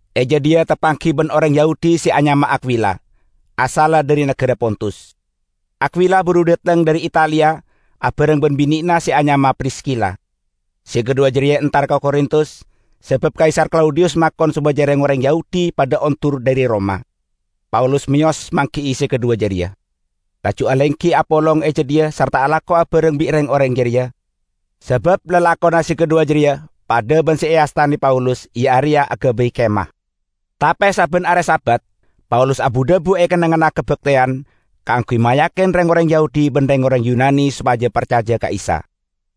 E jadhiya tapanggi ban oreng Yahudi se anyama Akwila, asalla dhari nagara Pontus. Akwila buru dhateng dhari Italia abareng ban binena se anyama Priskila. Se kadhuwa jareya entar ka Korintus sabab Kaisar Klaudiyus makon sopaja reng-oreng Yahudi padha ondur dhari Roma. Paulus meyos manggi'i se kadhuwa jareya, laju alenggi apolong e jadhiya sarta alako abareng bi' reng-oreng jareya, sabab lalakonna se kadhuwa jareya padha ban se eastane Paulus, iya areya agabay kemah. Tape sabban are Sabat Paulus abu-dhabu e kennengnganna kabakteyan kaangguy mayakin reng-oreng Yahudi ban reng-oreng Yunani sopaja parcaja ka Isa.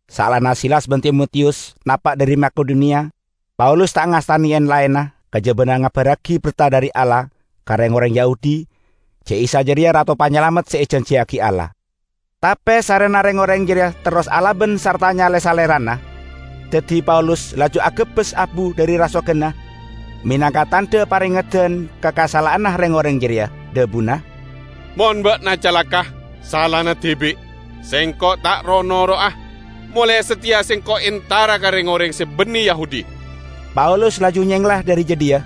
Saellana Silas ban Timotiyus napa' dhari Makedoniya, Paulus ta' ngastane en-laenna kajabana ngabarragi berta dhari Allah ka reng-oreng Yahudi ja' Isa jareya Rato Panyalamet se ejanjiyagi Allah. Tape sarrena reng-oreng jareya terros alaban sarta nyale salerana, daddi Paulus laju agebbes abu dhari rasoganna menangka tandha parengeddan ka kasala'anna reng-oreng jareya. Dhabuna, "Mon ba'na calaka', salana dibi'! Sengko' ta' ro'-noro'a! Molae sateya sengko' entara ka reng-oreng se banne Yahudi." Paulus laju nyengla dhari jadhiya,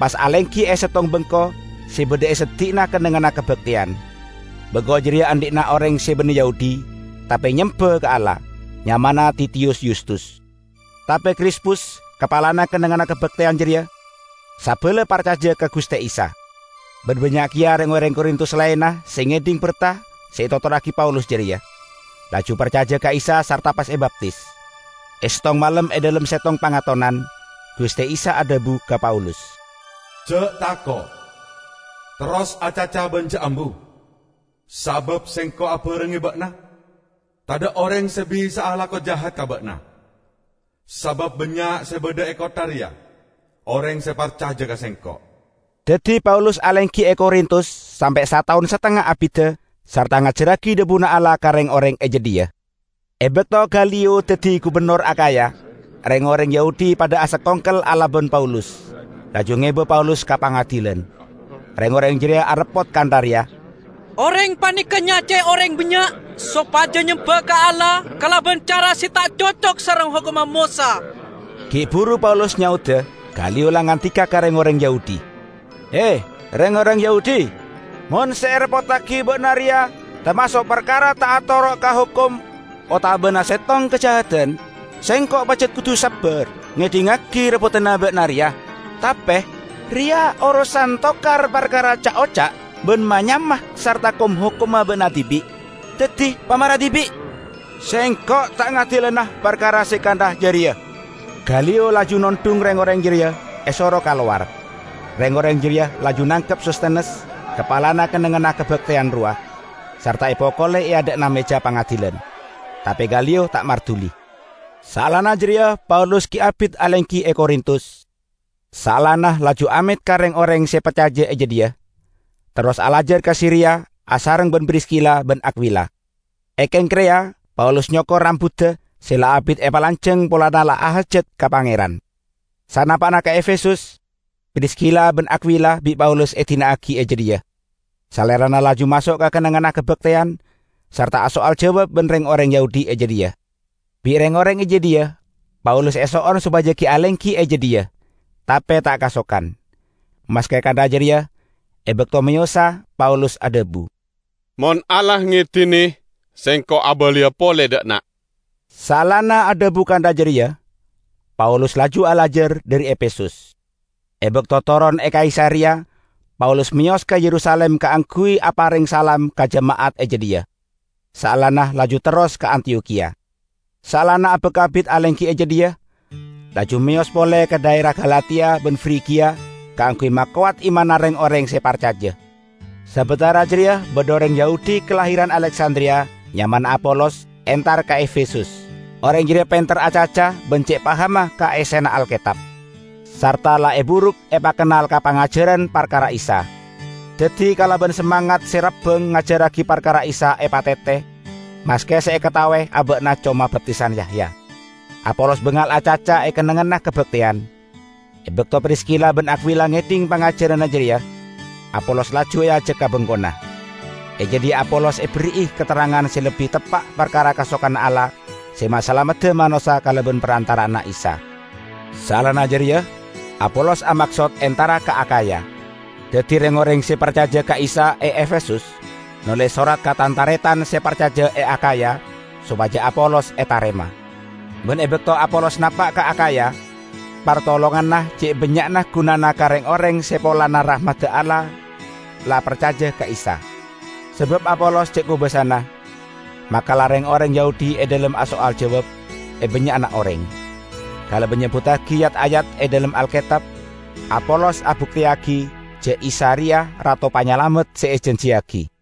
pas alenggi e settong bengko se badha e seddi'na kennengnganna kabakteyan. Bengko jareya andhi'na oreng se banne Yahudi, tape nyemba ka Allah, nyamana Titiyus Yustus. Tape Krispus, kapalana kennengnganna kabakteyan jareya sabala parcaja ka Guste Isa. Ban bannya' keya reng-oreng Korintus laenna se ngedhing berta se etotorragi Paulus jareya, laju parcaja ka Isa sarta pas ebaptis. E settong malem e dhalem settong pangatonan, Guste Isa adhabu ka Paulus, "Ja' tako'! Terros acaca ban ja' ambu. Sabab Sengko' abarengnge ba'na. Tadha' oreng se bisa'a alako jahat ka ba'na, sabab bannya' se badha e kottha reya oreng se parcaja ka Sengko'." Daddi Paulus alenggi e Korintus sampe' sataon satengnga abidda sarta ngajarragi dhabuna Allah ka reng-oreng e jadhiya. E bakto Galiyo daddi gubennor Akhaya, reng-oreng Yahudi padha asakongkel alaban Paulus, laju ngeba Paulus ka pangadilan. Reng-oreng jareya areppot kantha reya, "Oreng paneka nyacae oreng bannya' sopaja nyemba ka Allah kalaban cara se ta' cocok sareng hokomma Mosa!" Gi' buru Paulus nyaoda, Galiyo la ngandika ka reng-oreng Yahudi, "He, reng-oreng Yahudi! Mon se ereppottagi ba'na reya tamaso' parkara ta' atoro' ka hokom otabana settong kajahadan, sengko' pajat kodu sabbar ngedhingngagi reppodanna ba'na reya. Tape reya orosan tokar parkara ca'-oca' ban ma-nyama sarta kom-hokomma ba'na dibi'! Daddi pamare dibi'. Sengko' ta' ngadilana parkara se kantha jareya!" Galiyo laju nondhung reng-oreng jareya, esoro kalowar. Reng-oreng jareya laju nangkep Sostenes, kapalana kennengnganna kabakteyan rowa, sarta epokole e adha'na meja pangadilan. Tape Galiyo ta' marduli. Saellana jareya Paulus gi' abit alenggi e Korintus. Saellana laju amet ka reng-oreng se parcaja e jadhiya, terros alajar ka Siria asareng ban Priskila ban Akwila. E Kengkreya, Paulus nyokor rambudda se la abit epalanjang polana la ahajat ka Pangeran. Sanapa'na ka Efesus, Priskila ban Akwila bi' Paulus edina'agi e jadhiya, salerana laju maso' ka kennengnganna kabakteyan sarta asoal jawab ban reng-oreng Yahudi e jadhiya. Bi' reng-oreng e jadhiya Paulus eso'on sopaja gi' alenggi e jadhiya, tape ta' kasokan. Maske kantha jareya, e bakto meyosa Paulus adhabu, "Mon Allah ngedine, sengko' abaliya pole dha' enna'." Saellana adhabu kantha jareya, Paulus laju alajar dhari Efesus. E bakto toron e Kaisareya Paulus meyos ka Yerusalim kaangguy apareng salam ka jema'at e jadhiya, saellana laju terros ka Antiyokhiya. Saellana abak abit alenggi e jadhiya, laju meyos pole ka dhaera Galatia ban Frigia kaangguy makowat imanna reng-oreng se parcaja. Sabatara jareya badha oreng Yahudi kalahiran Aleksandriya, nyamana Apolos, entar ka Efesus. Oreng jareya penter acaca ban ce' pahamma ka essena Alketab, sarta la eburuk epakennal ka pangajaran parkara Isa. Daddi kalaban samangat se rabbang ngajarragi parkara Isa epatete, maske se ekataowe aba'na coma baptisan Yahya. Apolos bangal acaca e kennengnganna kabakteyan. E bakto Priskila ban Akwila ngedhing pangajaranna jareya, Apolos laju eajak ka bengkona. E jadhiya Apolos eberri'i katerrangan se lebbi teppa' parkara kasokanna Allah se masalamedda manossa kalaban parantara'anna Isa. Saellana jareya Apolos amaksod entara ka Akhaya. Daddi reng-oreng se parcaja ka Isa e Efesus noles sorat ka tan-taretan se parcaja e Akhaya sopaja Apolos etarema. Ban e bakto Apolos napa' ka Akhaya, partolonganna ce' bannya'na gunana ka reng-oreng se polana rahmadda Allah la parcaja ka Isa. Sabab Apolos ce' kobasana, makala reng-oreng Yahudi e dhalem asoal jawab e bannya'na oreng. Kalaban nyebbuttagi yat-ayat e dhalem Alketab, Apolos abukteyagi ja' Isa reya Rato Panyalamet se ejanjiyagi.